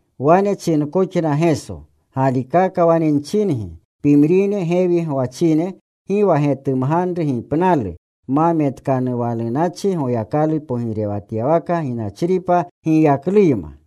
Wane chinkoxna Geso, “Galikaka wane nchingi, pimrine gewi gwachine gi wa getumganru gipnalu ma metkanuwalunachi Goyakalu pogirewatyawaka ginachripa giyakluyma.”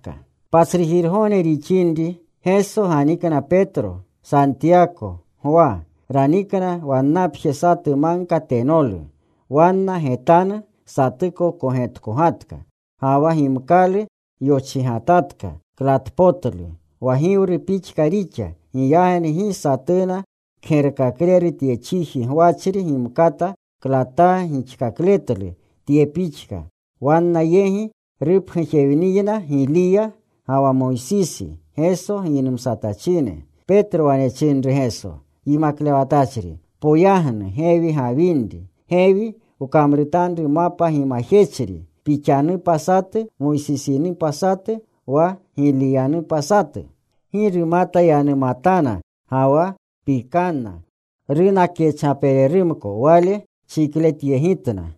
Patsrujirgogne rixinri, Geso ganikna Petro, Santiyako, Gwa. Ranikna wannapje satu magka tenolu. Wanna getanu satuko kogetkogatka. Ga wa gimkalu yochigatatka klatpotlu. Wa giwru pixka rixa. Giyagni gi satuna kgerkakleru tye chiji gwachri gimkata klataa gixkakletlu tye pixka. Wanna yegi rupgujewniyna Giliya ga wa Moysisi, Geso giynumsatachine. Petro, wane chinru Geso, “Yimaklewatachri, poyagnu gewi gawinri. Gewi wkamrutanru mapa gimajechri. Pixanupa satu, Moysisinupa satu, wa Giliyanupa satu.” Gi rumata yanumatana, ga wa pikanna. Runa kyachgapererumko. Wale chikletyegitna.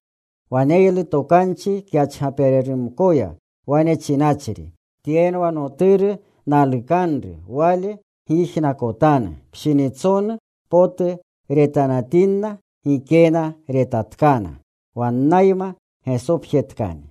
Waneylu tokanchi kyachgapererumkoya, wane chinachri, “Tyenwa Noturu nalukanru. Wale gyijnakotanu.” Pshinitsonu potu retanatinna, gikena retatkana wannayma. Gesopjetkani.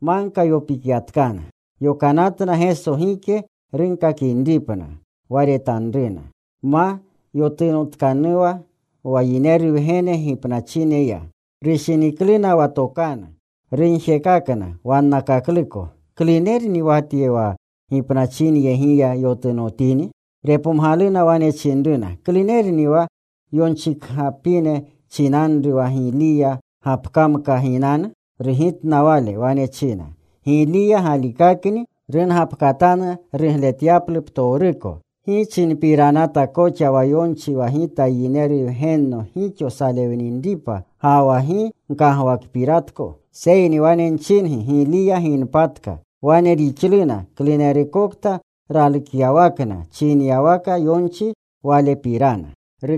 Magka yopikyatkana. Yokanatna Geso gike runkakinripna wa retanruna, ma yotunotkanuwa wa Yineru Wgene gipnachineya. Rushinikluna wa tokanu. Rugjekakna wannakakluko, “¿Klunerni wa tye, wa gipnachinyegiya yotunotini?” Repomgaluna. Wane chinruna, “¿Klunerni wa yonchikgapine chinanru wa Giliya gapkamka ginanu?” Rugitna Wale. Wane china, “Giliya galikakni rungapkatanu rugletyaplu ptowruko. ¿Gi chinpiranata koxa wa yonchi wa Gita Yineru Wgenno gixo nsalewninripa, ga wa gi nkagwakpiratko? Seyni wane nchingi Giliya ginpatka. Wane rixluna klunerukokta ralukyawakna chinyawaka yonchi walepirana.”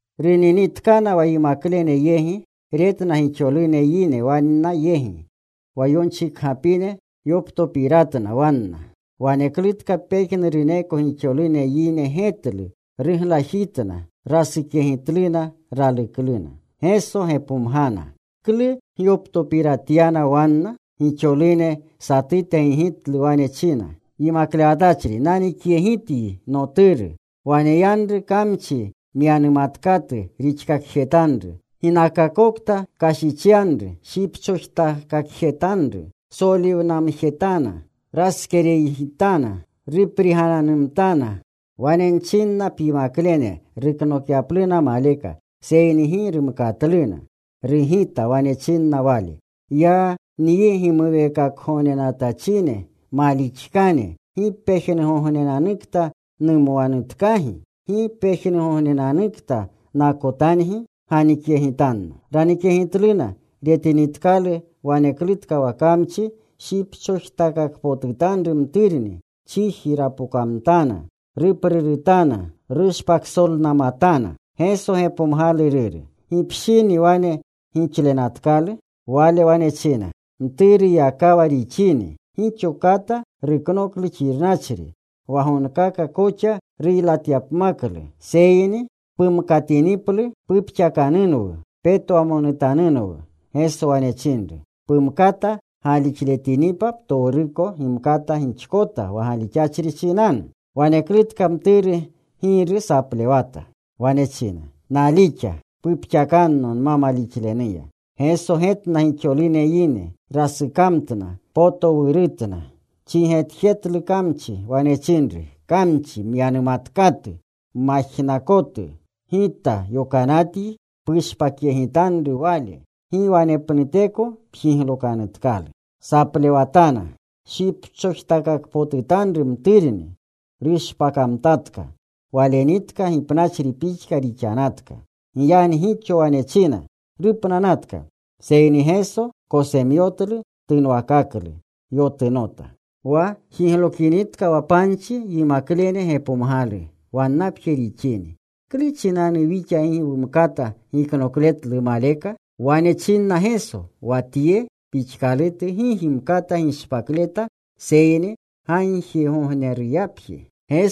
Runinitkana wa yimaklene yegi. Retna gixolune yine wanna yegi. Wa yonchikgapine yoptopiratna wanna. Waneklutka pejnuruneko gixolune yine getlu. Ruglajitna. Rasukyegitluna. Ralukluna. Geso gepomgana, “¿Klu gyoptopiratyana wanna?” Gixolune satute gigitlu. Wane china, “Yimaklewatachri, nanikyegityi noturu. Waneyanru kamchi myanumatkatu rixkakjeru. Ginakakokta kashichyanru shipchojtakakjetanru. Soliwanamjetana. Raskereygitana. Ruprigananumtana. Wane nchinna pyimaklene ruknokyapluna maleka, seyni gi rumkatluna.” Rugita. Wane chinna Wale, “¡Ya nyi gimuweekakgognenatachine malixkane! ¿Gi pejnugognenanukta numwanutkagi? ¿Gi pejnugognenanukta nakotangi? Ganikyegitanno.” Ranikyegitluna. Retinitkalu waneklutka wa kamchi shipchojtakakpotutanru mturni. Chiji rapokamtana. Ruprurutana. Rushpaksolnamatana. Geso gepomgalu ruru, “¿Gipshini wane gixlenatkalu?” Wale wane china, “Mturuyakawa rixini. Gixo kata ruknoklu xirnachri, wa gonga koxa ruylatyapmaklu, seyni pumkatiniplu pupxakanunwu. Petwamonutanunwu.” Geso wane chinru, “Pumkata galixletinipa, ptowruko gimkata gixkota wa galixachri chinanu.” Waneklutka mturu giru saplewata. Wane china, “Nalixa. Pupxakanno nma malixlenuya.” Geso getna gixolune yine. Rasukamtna. Potowurutna. Chigetjetlu kamchi. Wane chinru, “Kamchi myanumatkatu majnakotu, Gita yokanatyi pushpakyegitanru wale. Gi wanepnuteko pjiglokanutkalu.” Saplewatana. Shipchojtakakpotutanru mturni. Rushpakamtatka. Walenitka gipnachri pixka rixanatka. Giyagni gixo wane china, “Rupnanatka.” Seyni Geso kosemyotlu. Tunwakaklu. Yotunota. Wa jiglokinitka wa panchi yimaklene gepomgalu wannapje rixini, “¿Klu chinanu wixa gi wumkata giknokletlu maleka?” Wane chinna Geso, “Wa tye pixkalutu gi gimkata gishpakleta seyni gagjigognerupjeya.”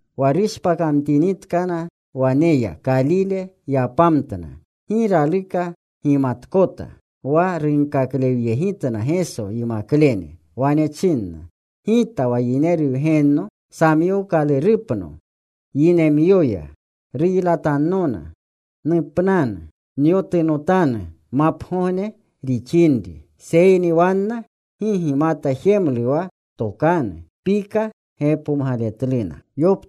Wa rushpakinitkana waneya, Kalile yapamtna. Gi raluka gimatkota. Wa runkaklewyegitna Geso yimaklene. Wane chinna, “Gita wa Yineru Wgenno samyookalurupno yinemyoya. Ruylatannona. Nupnanu. Nyotunotanu mapgogne rixinri.” Seyni wanna gi gimata jemlu wa tokanu. Pika gepomgaletluna.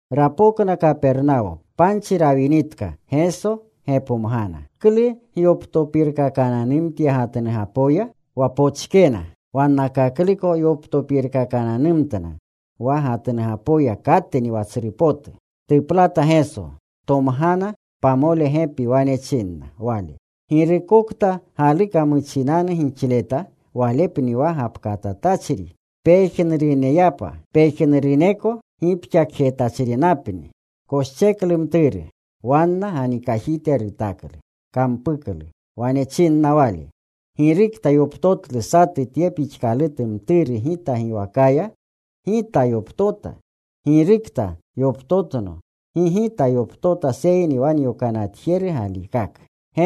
Rapokna Kapernawo. Panchi rawinitka, Geso gepomgana, “¿Klu gyoptopirkakananumtya gatnugapoya?” Wa pochkena. Wannakakluko yoptopirkakananumtna wa gatnugapoya katni wa tsru potu. Tuplata Geso. Tomgana pamole gepi. Wane chinna Wale, “Girukokta galuka muchinanu gixleta, walepni wa gapkatpotutachri pejnuruneyapa. Pejnuruneko gipxakjetachrinapni.” Koscheklu mturu. Wanna ganikajite rutaklu. Kampuklu. Wane chinna Wale, “Girukta yoptotlu satu tye pixkalutu mturu Gita giwakaya, Gita yoptota. Girukta yoptotno, gi Gita yoptota seyni wa nyokanatjeru galikaka.”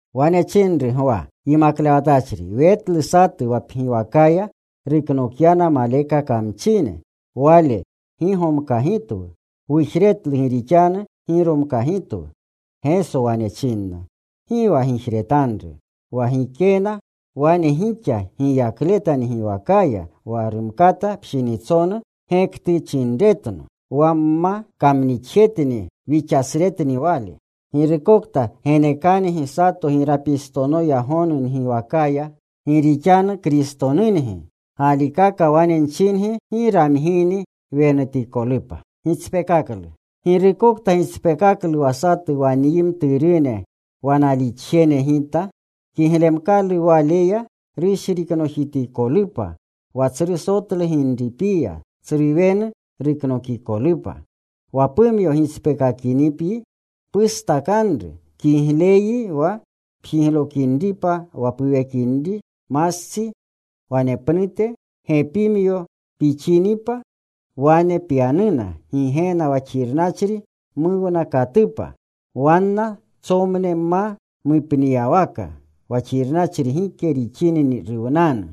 Wane chinru Gwa, “Yimaklewatachri, wetlu satu wa pgiwakaya ruknokyana maleka kamchine. Wale gi gomkagitwu. Wujretlu gi rixanu gi romkagitwu.” Geso wane china, “Gi wa gijretanru. Wa gikena wane gixa giyakleta ngiwakaya wa rumkata pshinitsonu gektuchinretno. Wa wma kamnixjetni wixasretni wale. Girukokta genekangi sato girapistonoya gonu ngiwakaya gi rixanu Kristonungi, galikaka wane nchingi gi ramgini wenutikolupa. “Girukokta gitspeekaklu wa satu wa nyi mturune wa nalixjene Gita, kiglemkalu waleya rushriknojitikolupa wa tsru sotlu ginripiya, tsru wenu ruknokikolupa. Wa pumyo gitspeekakinipyi pustakanru. Kigleyyi wa pjiglokinripa wa puwekinri mastsi, wanepnute gepimyoyi pixinipa wane pyanuna Gigena wa xirnachri muwnakatupa. Wanna tsomne ma mupniyawaka. Wa xirnachri gike rixini ruwnanu.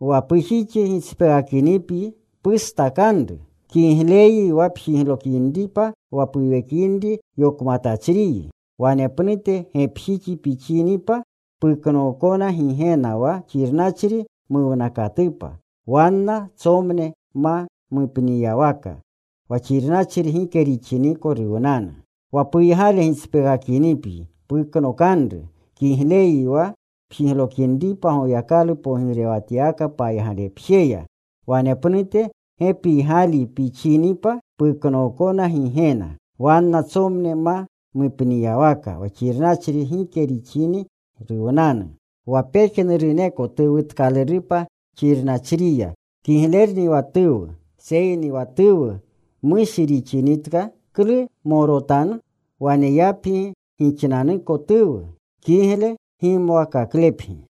Wa pujixi gitspeekakinipyi, pustakanru. Kigleyyi wa pjiglokinripa wa puwekinri yokmatachriyi, wanepnute gepijixyi pixinipa puknookona Gigena wa xirnachri muwnakatupa. Wanna tsomne ma mupniyawaka. Wa xirnachri gike rixini ruwnanu. Wa puygale gitspeekakinipyi, puknokanru. Kigleyyi wa pjiglokinripa Goyakalu pogirewatyawaka paygalepjeya wanepnute gepiygaleyi pixinipa puknookona Gigena. Wanna tsomne ma mupniyawaka. Wa xirnachri gike rixini ruwnanu. “Wa pejnuruneko tuwutkalurupa xirnachriya. Kiglerni wa tuwu, seyni wa tuwu mushi rixinitka ¿klu gmorotanu? Waneyapgi gixnanuko tuwu. Kigle gimwakaklepgi.”